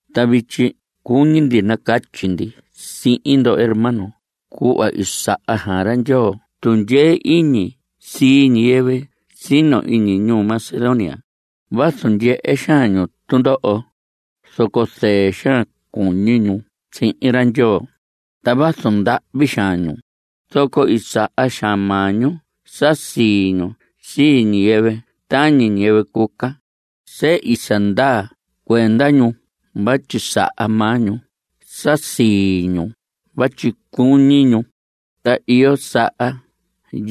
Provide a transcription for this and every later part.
Ta vityi cuñi ndi nacatyi ndi sihin ndo hermanos cuhva i saha xaan ra Ndyoo tundyee iñi sii ñiyɨvɨ sino iñi ñuu Macedonia. Vazu ndyehe xaan ñu tundoho, zoco zɨɨ xaan cuñi ñu sihin ra Ndyoo. Ta vazu ndahvi xaan ñu, zoco i saha xaan maa ñu sa sii ñu sii ñiyɨvɨ tañi ñiyɨvɨ cuca. Sehi sa ndaa cuenda ñu vatyi saha maa ñu sa sii ñu vatyi cuñi ñu. Ta iyo saha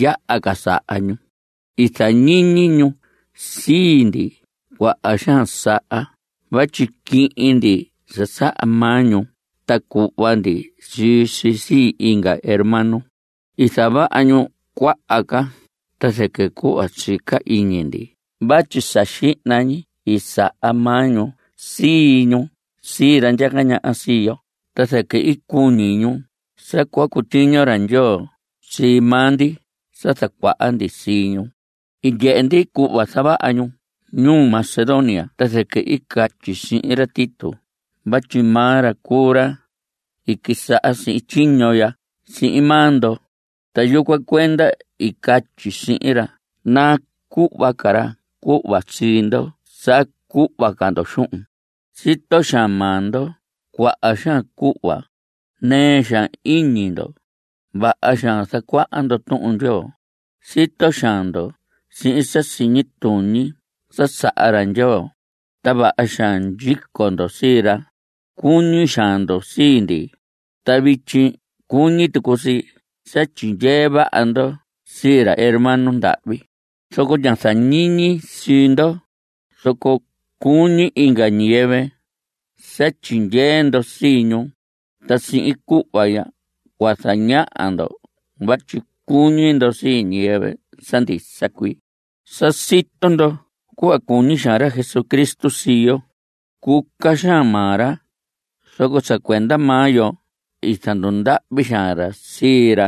yaha ca saha ñu. I zañiñi ñu sii ndi cuaha xaan saha vatyi quihin ndi sa saha maa ñu ta cuhva ndi sii si sii inga hermano. I zavaha ñu cuaha ca ta zɨquɨ cuhva sica iñi ndi vatyi sa xihna ñi i saha maa ñu sii ñu sii ra ndyaca ñaha sii yo ta zɨquɨ i cuñi ñu sa cua cutyiño ra Ndyoo sii maa ndi sa zacuaha ndi sii ñu. I ndyehe ndi cuhva zavaha ñu ñuu Macedonia, ta zɨquɨ i catyi sihin ra Tito vatyi maa ra cuu ra i quisaha sihin tyiño ya sihin maa ndo, ta yucuan cuenda i catyi sihin ra nacuhva ca ra cuhva sii ndo sa cuhva ca ndo xuhun. Sito xaan maa ndo cuaha xaan cuhva. Nɨɨ xaan iñi ndo. Vaha xaan zacuaha ndo Tuhun Ndyoo. Sito xaan ndo sihin sa siñi tuñi sa saha ra Ndyoo. Ta vaha xaan ndyico ndo sii ra. Cuñi xaan ndo sii ndi. Ta vityi cuñi tucu si sa tyindyee vaha ndo sii ra hermano ndahvi. Zoco ña zañiñi sii ndo. Zoco cuñi inga ñiyɨvɨ sa tyindyee ndo sii ñu. Ta sihin cuhva ya cua zañaha ndo vatyi cuñi ndo sii ñiyɨvɨ sa ndisa cuii. Sa sito ndo cuhva cuñi xaan ra Jesucristo sii yo. Cuca xaan maa ra, zoco sa cuenda maa yo i zandundahvi xaan ra sii ra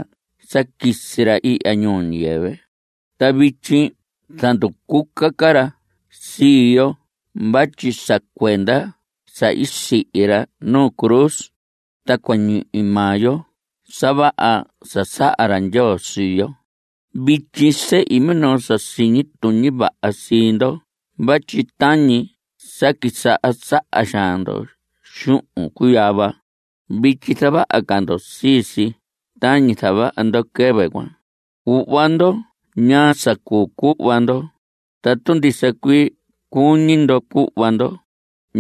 sa quisi ra ihya ñuu ñiyɨvɨ. Ta vityi zanducuca ra sii yo vatyi sa cuenda sa i sihi ra nuu cruz, ta cua ñihi maa yo sa vaha sa saha ra Ndyoo sii yo. Vityi sehi minoo sa siñi tuñi vaha sii ndo vatyi tañi sa quisaha saha xaan ndo xuhun cuyava, vityi zavaha ca ndo sii si tañi zavaha ndo quɨvɨ cuan. Cuhva ndo ñaa sa cuu cuhva ndo. Tatu ndisa cuii cuñi ndo cuhva ndo,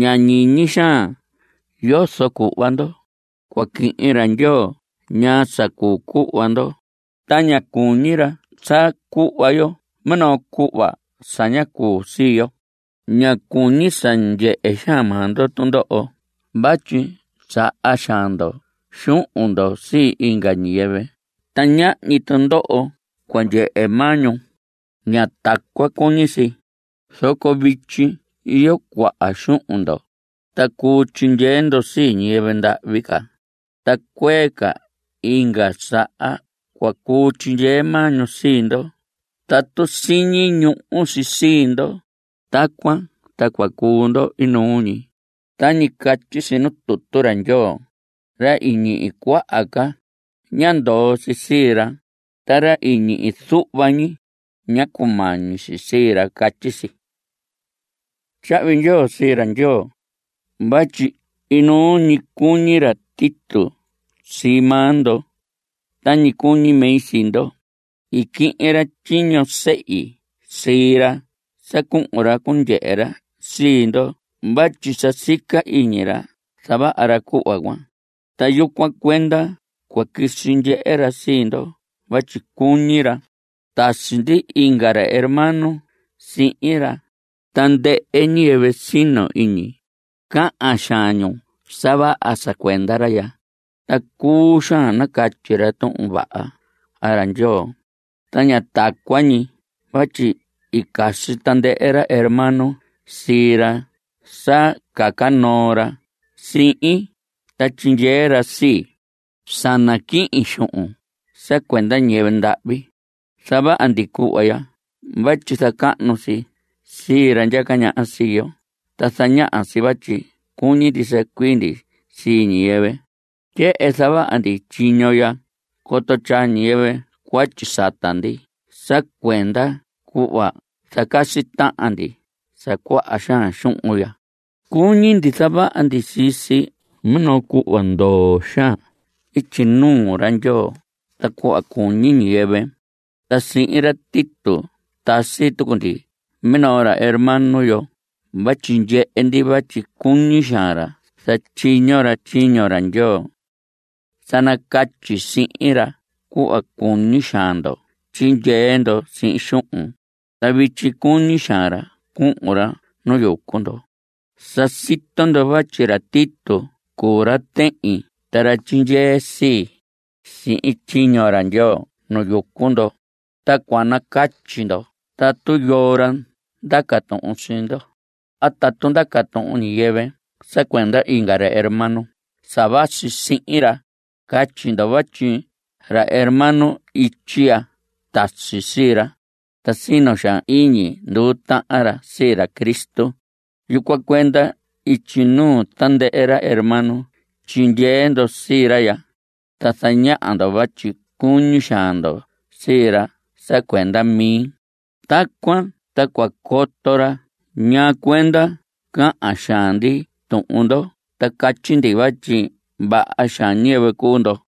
ña ñiñi xaan yozo cuhva ndo. Cua quihin ra Ndyoo ñaa sa cuu cuhva ndo. Ta ña cuñi ra sa cuhva yo minoo cuhva sa ña cuu sii yo. Ña cuñi sa ndyehe xaan maa ndo tundoho vatyi saha xaan ndo xuhun ndo sii inga ñiyɨvɨ ta ñahñi tundoho cua ndyehe maa ñu. Ña tacuan cuñi si. Zoco vityi iyo cuaha xuhun ndo, ta cuu tyindyee ndo sii ñiyɨvɨ ndahvi ca. Ta cuee ca inga saha cua cuu tyindyee maa ñu sii ndo tatu siñi ñuhu si sii ndo. Tacuan ta cua cuu ndo inuu ñi. Tañi catyi si nuu tutu ra Ndyoo: “Ra i ñihi cuaha ca, ñá ndoo si sii ra. Ta ra i ñihi zuhva ñi, ñá cumañi si sii ra.” Catyi si. Tyahvi ndyoo sii ra Ndyoo vatyi inuu ñi cuñi ra Tito sii maa ndo tañi cuñi mi sii ndo. I quihin ra tyiño sehi sii ra sa cuhun ra cundyehe ra sii ndo vatyi sa sica iñi ra zavaha ra cuhva cuan. Ta yucuan cuenda cua quisi ndyehe ra sii ndo vatyi cuñi ra. Tasi ndi inga ra hermano sihin ra. Tandɨhɨ ñiyɨvɨ sino iñi, cahan xaan nu sa vaha sa cuenda ra ya. Ta cuu xaan nacatyi ra Tuhun Vaha ra Ndyoo. Ta ña tacuan ñi vatyi i casi tandɨhɨ ra hermano sii ra sa caca noo ra sihin ta tyindyee ra sii, sa naquihin xuhun sa cuenda ñiyɨvɨ ndahvi. Zavaha ndi cuhva ya vatyi zacahnu si sii ra ndyaca ñaha sii yo ta zañaha si vatyi cuñi ndisa cuii ndi sii ñiyɨvɨ. Tyehen zavaha ndi tyiño ya coto tyaa ñiyɨvɨ cuatyi sata ndi sa cuenda cuhva zacasi tahan ndi sa cuaha xaan xuhun ya. Cuñi ndi zavaha ndi sii si minoo cuhva ndoo xaan ityi nuu ra Ndyoo ta cuhva cuñi ñiyɨvɨ. Ta sihin ra Tito tasi tucu ndi minoo ca ra hermano yo vatyi ndyehe ndi vatyi cuñi xaan ra zatyiño ra tyiño ra Ndyoo. Sa nacatyi sihin ra cuhva cuñi xaan ndo tyindyee ndo sihin xuhun, ta vityi cuñi xaan ra cuhun ra nu yucu ndo. Sa sito ndo vatyi ra Tito cuu ra tehin ta ra tyindyee sii, sihin tyiño ra Ndyoo nu yucu ndo. Tacuan nacatyi ndo tatu yoo ra ndaca tuhun sii ndo. A tatu ndaca tuhun ñiyɨvɨ sa cuenda inga ra hermano sa vasi sihin ra, catyi ndo vatyi ra hermano ityi ya tasi sii ra, ta sino xaan iñi nduu tahan ra sii ra Cristo. Yucuan cuenda ityi nuu tandɨhɨ hermano tyindyee ndo sii ra ya, ta zañaha ndo vatyi cuñi xaan ndo sii ra sa cuenda mi. Tacuan ta cua coto ra ñaa cuenda cahan xaan ndi tuhun ndo ta catyi ndi vatyi vaha xaan ñiyɨvɨ cuu ndo.